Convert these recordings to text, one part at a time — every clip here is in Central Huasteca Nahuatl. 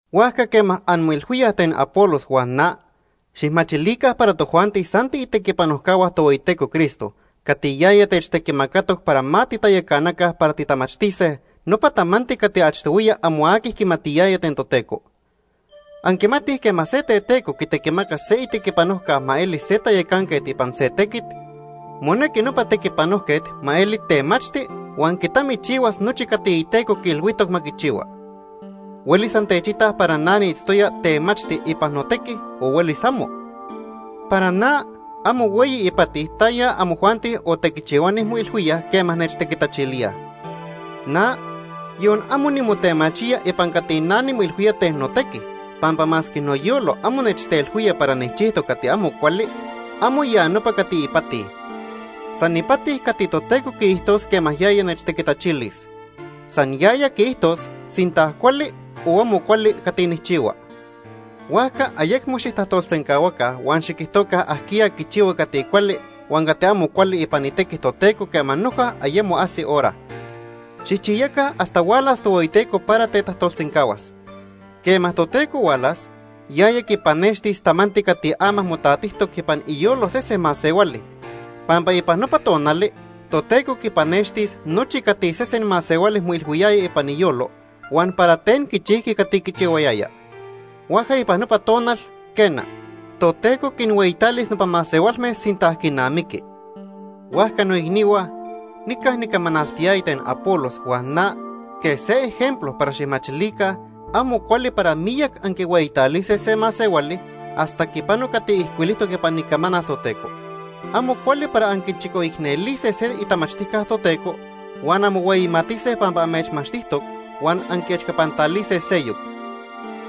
Huajca quema anmoilhuíaj ten Apolos huan na, xijmachilica para tojuanti san tiitequipanojcahua Tohueyiteco Cristo cati yaya techtequimacatoc para ma titayacanaca para titamachtise nopa tamanti cati achtohuiya amo aqui quimatiyaya ten Toteco. Anquimatij quema se teteco quitequimaca se itequipanojca ma eli se tayacanquet ipan se tequit, monequi nopa tequipanojquet ma eli temachti huan quitamichihuas nochi cati iteco quiilhuijtoc ma quichihua. Huelis antechitaj para na niitztoya temachti ipan notequi, o huelis amo. Para na, amo hueyi ipati taya amojuanti o tequichihuani moilhuíaj quema nechtequitachilíaj. Na, yon amo nimotemachía ipan cati na nimoilhuía ten notequi, pampa masque noyolo amo nechtelhuía para nijchijtoc cati amo cuali, amo ya nopa cati ipati. San ipati cati Toteco quiijtos quema yaya nechtequitachilis. San yaya quiijtos sinta cuali o amo cuali cati nijchihua. Huajca ayecmo xijtajtolsencahuaca huan xiquijtoca ajquiya quichihua cati cuali huan cati amo cuali ipan itequi Toteco quema noja ayemo ajsi hora. Xijchiyaca hasta hualas Tohueyiteco para tetajtolsencahuas. Quema Toteco hualas, yaya quipanextis tamanti cati ama motatijtoc ipan iyolo sesen masehuali, pampa ipan nopa tonali Toteco quipanextis nochi cati sesen masehuali moilhuiyaya ipan iyolo huan para ten quichijqui cati quichihuayaya. Huajca ipan nopa tonal, quena, Toteco quinhueyitalis nopa masehualme sinta quinamiqui. Huajca noicnihua, nica nicamanaltiyaya ten Apolos huan na quej se ejemplo para xijmachilica amo cuali para miyac anquihueyitalise se masehuali hasta quipano cati ijcuilijtoc ipan Icamanal Toteco. Amo cuali para anquichicoicnelise se itamachtijca Toteco huan anmohueyimatise pampa amechmachtijtoc huan anquiechcapantalise seyoc.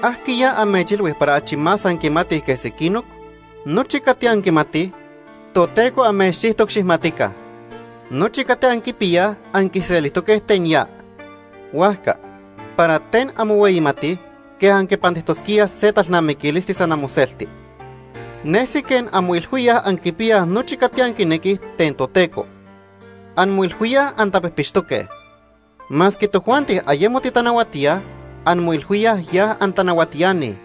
¿Ajquiya amechilhui para achi más anquimatij que sequinoc? Nochi cati anquimatij, Toteco amechchijtoc xijmatica. Nochi cati anquipiyaj anquiselijtoque ten ya. Huajca, ¿para ten anmohueyimatij quej anquipantijtosquíaj se talnamiquilisti san amoselti? Nesi quej anmoilhuíaj anquipiyaj nochi cati anquinequij ten Toteco. Anmoilhuíaj antapijpixtoque. Masque tojuanti ayemo titanahuatíaj, anmoilhuíaj ya antanahuatiani.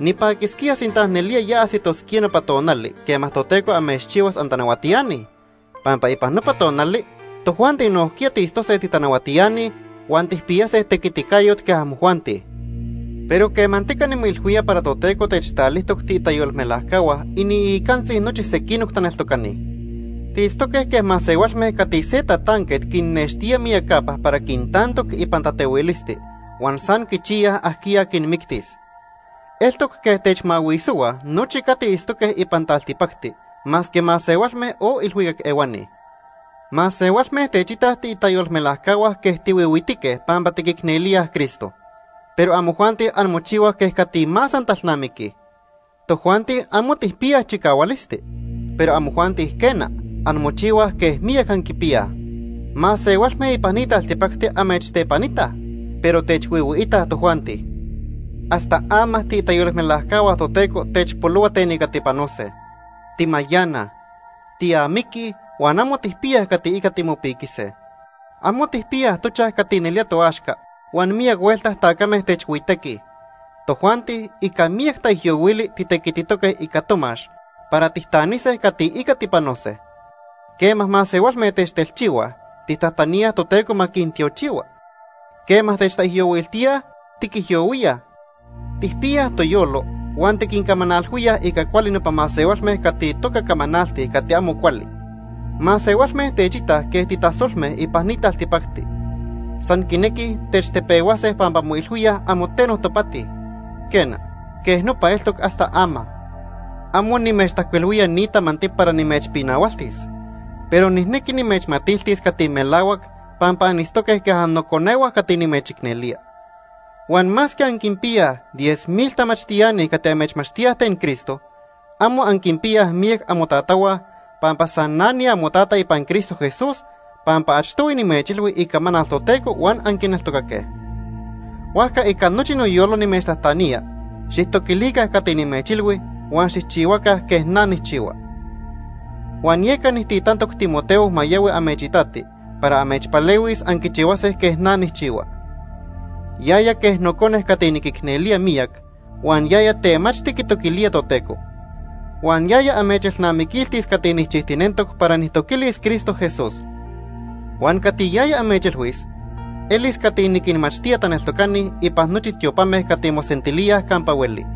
Nipaquisquía sinta nelía ya ajsitosquía nopa tonali quema Toteco amechchihuas antanahuatiani, pampa ipan nopa tonali tojuanti nojquiya tiitztose titanahuatiani huan tijpiyase tequiticayot quej amojuanti. Pero quemantica nimoilhuía para Toteco techtalijtoc tiitayolmelajcahua iniicantzi nochi sequinoc taneltocani. Tiitztoque quej masehualme cati se tatanquet quinnextía miyacapa para quintantoc ipan tatehuilisti huan san quichiyaj ajquiya quinmictis. Eltoc quej techmahuisohuaj nochi cati itztoque ipan taltipacti, masque masehualme o ilhuicac ehuani. Masehualme techitaj tiitayolmelajcahua quej tihuihuitique pampa tiquicnelíaj Cristo, pero amojuanti anmochihuaj quej cati más antalnamiquij. Tojuanti amo tijpiyaj chicahualisti, pero amojuanti quena, anmochihuaj quej miyac anquipiyaj. Masehualme ipan ni taltipacti amechtepanitaj, pero techhuihuiitaj tojuanti. Hasta ama tiitayolmelajcahua Toteco techpolohua ten ica tipanose. Timayanaj, tiamiquij huan amo tijpiyaj cati ica timopiquise. Amo tijpiyaj tochaj cati nelía toaxca huan miyac huelta tacame techhuitequij. Tojuanti ica miyac taijyohuili titequititoque ica tomax para tijtanise cati ica tipanose. Quema masehualme techtelchihuaj, tijtajtaníaj Toteco ma quintiochihua. Quema techtaijyohuiltíaj, tiquijyohuíaj. Tijpiyaj toyolo huan tiquincamanalhuíaj ica cuali nopa masehualme cati toca camanaltij cati amo cuali. Masehualme techitaj quej titasolme ipan ni taltipacti. San quinequij techtepehuase pampa moilhuíaj amo teno topati. Quena, quej nopa eltoc hasta ama. Amo nimechtajcuilhuía ni tamanti para nimechpinahualtis, pero nijnequi nimechmatiltis cati melahuac pampa anitztoque quej annoconehua cati nimechicnelía. Huan masque anquinpiyaj diez mil tamachtiani cati amechmachtíaj ten Cristo, amo anquinpiyaj miyac amotatahua, pampa san na niamotata ipan Cristo Jesús pampa achtohui nimechilhui icamanal Toteco huan anquineltocaque. Huajca ica nochi noyolo nimechtajtanía, xijtoquilica cati nimechilhui huan xijchihuaca quej na nijchihua. Huan yeca nijtitantoc Timoteo ma yahui amechitati para amechpalehuis anquichihuase quej na nijchihua. Yaya quej nocone cati niquicnelía miyac huan yaya temachti quitoquilía Toteco. Huan yaya amechelnamiquiltis cati nijchijtinentoc para nijtoquilis Cristo Jesús. Huan cati yaya amechilhuis elis cati niquinmachtía taneltocani ipan nochi tiopame cati mosentilíaj campa hueli.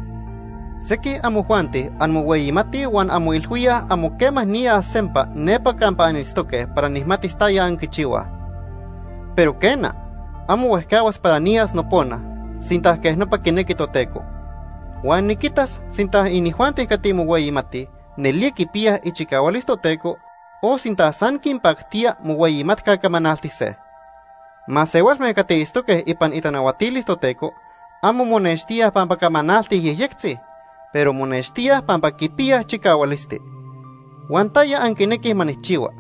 Sequij amojuanti anmohueyimatij huan anmoilhuíaj amo quema niyas sempa nepa campa anitztoque para nijmatis taya anquichihuaj. Pero, quena, amo huejcahuas para niyas nopona, sinta quej nopa quinequi Toteco. Huan niquitas sinta inijuanti cati mohueyimatij nelía quipiyaj ichicahualis Toteco o sinta san quinpactía mohueyimatca camanaltise. Masehualme cati itztoque ipan itanahuatilis Toteco amo monextíaj pampa camanaltij yejyectzi, pero monextíaj pampa quipiyaj chicahualisti. Huan ¿taya anquinequij ma nijchihua?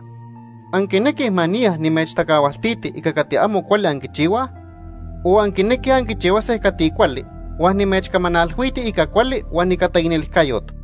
¿Anquinequij ma niya nimechtacahualtiti ica cati amo cuali anquichihuaj? O ¿anquinequij anquichihuase cati cuali huan nimechcamanalhuiti ica cuali huan ica taicnelijcayot?